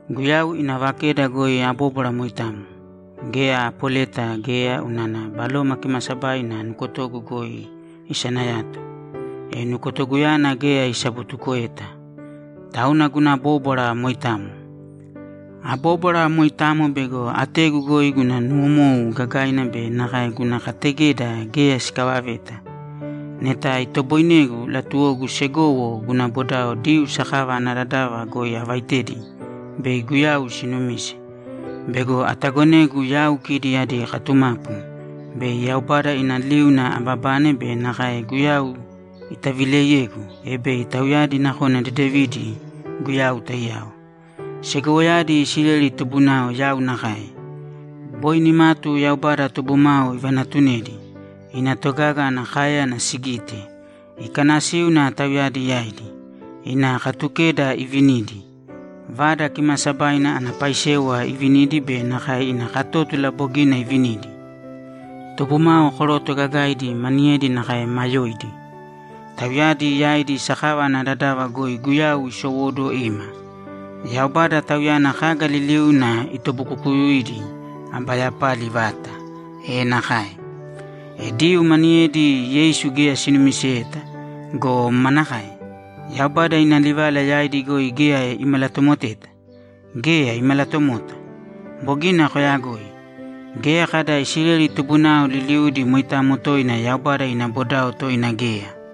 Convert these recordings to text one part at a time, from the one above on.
Guyau ina vakeda goi abóbwara moitamo. Geya apoleta geya unana Baloma Kimaasabaina nukotogu goi isanayato, e nukotoguyana geya isabutukoeta. Tauna guna bóbwara moitamo. Abóbwara moitamo bego ategu goi guna nuwomou gagaina be nakae guna kategeda geya sikavaveta. Neta itoboinegu, latuwogu segowo guna bodao Diyuu sakava ana dadava goi avaitedi bei Guyau sinumise. Bego atagonegu yau kidi adi katumapu bei Yaubada ina liuna ababane be nakae Guyau itavileiyegu, e bei tauyadi nakona dedevidi Guyau taiyao. Segowoyadi Isileli tubunao yau nakae. Boi nimatu Yaubada tubumao ivanatunedi, ina togaga ana káeyana sigite, ikanasíuna tauyadi yaidi, ina Katukeda ivinidi, Vada Kimaasabaina ana paisewa ivinidi be nakae ina katótula bogina ivinidi. Tubumao koroto gagaidi maniyedi nakae maa yoidi. Tauyadi yaidi sakava ana dadava goi Guyau isowóduwo ima. Yaubada, Tauyana kaga liliuna itobuukukuidi, aba yapali vata! E nakae! E Diyuu maniyedi Yeisu geya sinumiseyeta go, manakae? Yaubada ina livala yaidi goi geya imalatomoteta? Geya, imalatomota. Bogina koyagoi. Geya kada Isileli tubunao liliudi moitamo toina Yaubada ina bodao toina geya.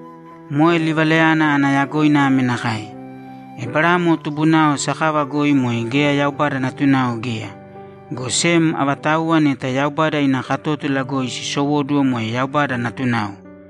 Moe livalayana ana yagoina ame nakae: Eberamo tubunao sakava goi moe geya Yaubada natunao geya, go sem avatauwa neta Yaubada ina katótula goi sisowóduwo moe Yaubada natunao.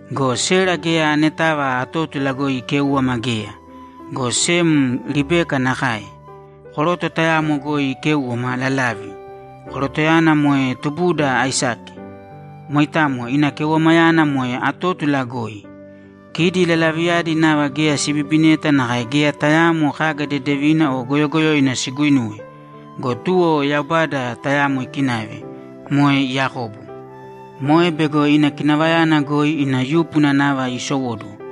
Go Sera geya anetava atótula goi ikéuwama geya, go sem Ribeka nakae. Koroto tayamo goi ikéuwama lalavi; korotoyana moe tubuda Aisake. Moitamo ina keuwamayana moe atótula goi. Kidi lalaviyadi nava geya sibibineta nakae geya tayaamo kaga dedevina o goyogoyoina siguinuwe go, tuwo Yaubada tayamo ikinave, moe Yakobo. Moe bego ina kinavayana goi ina yúpuna nava iisowóduwo.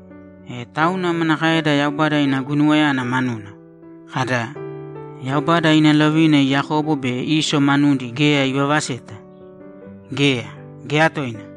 E tauna manakaeda Yaubada ina guinuwayana manuna? Kada, ‘Yaubada ina lovina Yakobo be Iso manudi geya ivavaseta’? Geya, geya toina!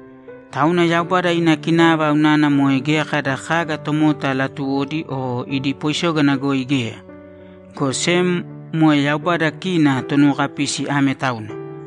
Tauna Yaubada ina kinava unana moe geya kada kaga tomota latuwodi o idi poisógana goi geya, go sem moe Yaubada kina Tonuwokapisi ame tauna.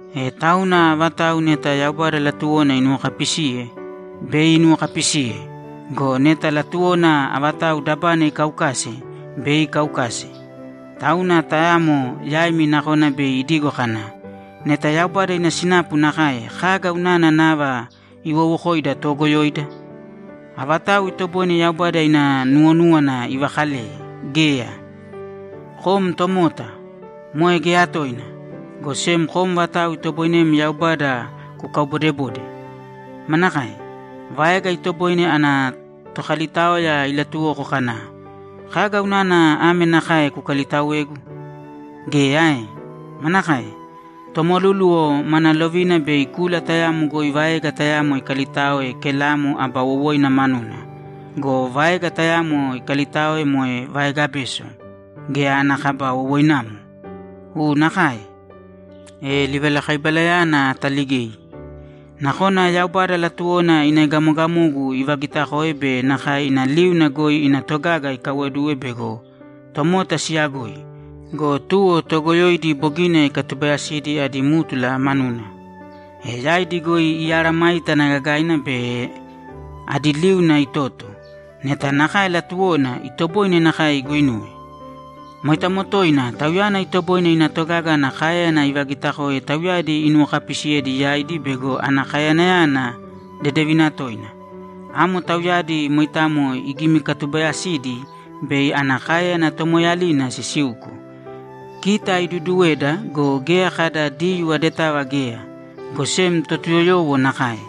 E tauna avatau neta Yaubada latuwona inuwokapisiye, bei inuwokapisiye go, neta latuwona avatau dabana ikaukase, bei ikaukase. Tauna tayamo yaimi nakona bei idigo kana, ‘Neta Yaubada ina sinapu nakae, kaga unana nava iwowokoida toogoyoida? Avatau itoboine Yaubada ina nuwonúwana ivakaleye? Geya!’ Kom tomota! Moe geya toina, go sem kom vatau itoboinem Yaubada kukaubodebode? Manakae? Vaega itoboine ana tokalitaoya ilatuwoko kana, ‘Kaga unana ame nakae kukalitaoegu?’ Geya ae? Manakae? Tomolúluwo mana lovina bei kula tayamo goi vaega tayamo ikalitaoe kelamo aba wowoina manuna go, vaega tayamo ikalitaoe moe vaega beso geya ana kaba wowoinamo? U nakae! E livalakaibalayana ataligei. Nakona Yaubada latuwona ina egamogamogu ivagitakoe be nakae ina liuna goi ina togaga ikaiwoduwe bego tomota siyagoi go, tuwo toogoyoidi bogina ikatubaayasidi adí mtula manuna, e yaidi goi imesayágana gagaina be adi liuna itoto. Neta nakae latuwona, itoboine nakae iguinuwe. Moitamo toina Tauyana itoboine ina togaga ana káeyana ivagitakoe tauyadi inuwokapiisiyedi yaidi bego ana kaeyanayana dedevina toina. Amo tauyadi moitamo igimikatubayasidi bei ana káeyana tomoeeyalina sisiuko. Kita iduduweda go, geya kada Diyuu adetava geya, go sem Totuyoyowo nakae.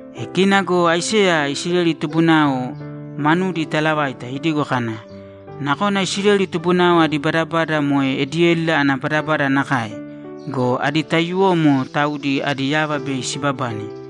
E kina go Aiseya Isileli tubunao manudi italavaita idigo kana, ‘Nakona Isileli tubunao adi badabada moe ediédila ana badabada nakae go, adi taiyuwomo taudi adi yava bei sibabane.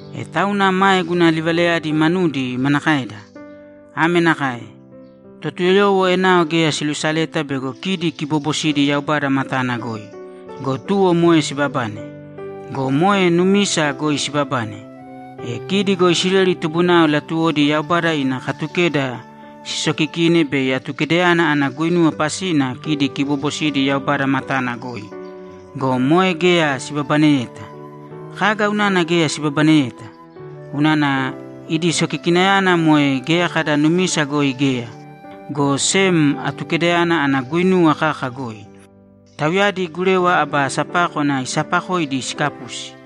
E tauna mae guna livalayadi manudi manakaeda? Ame nakae: Totuyoyowo enao geya silusaleyeta bego kidi kiboobosidi Yaubada matana goi go, tuwo moe sibabane. Go moe numisa goi sibabane. E kidi go Isileli tubunao latuwodi Yaubada ina Katukeda sisokikine bei Atukedayana ana guinuwa pasina kidi kiboobosidi Yaubada matana goi go, moe geya sibabaneyeta. Kaga unana geya sibabaneyeta? Unana idi sokikinayana moe geya kada numisa goi geya, go sem Atukedayana ana guinuwa kaka goi. Tauyadi Gurewa aba sapákwana isapakoidi sikapusi.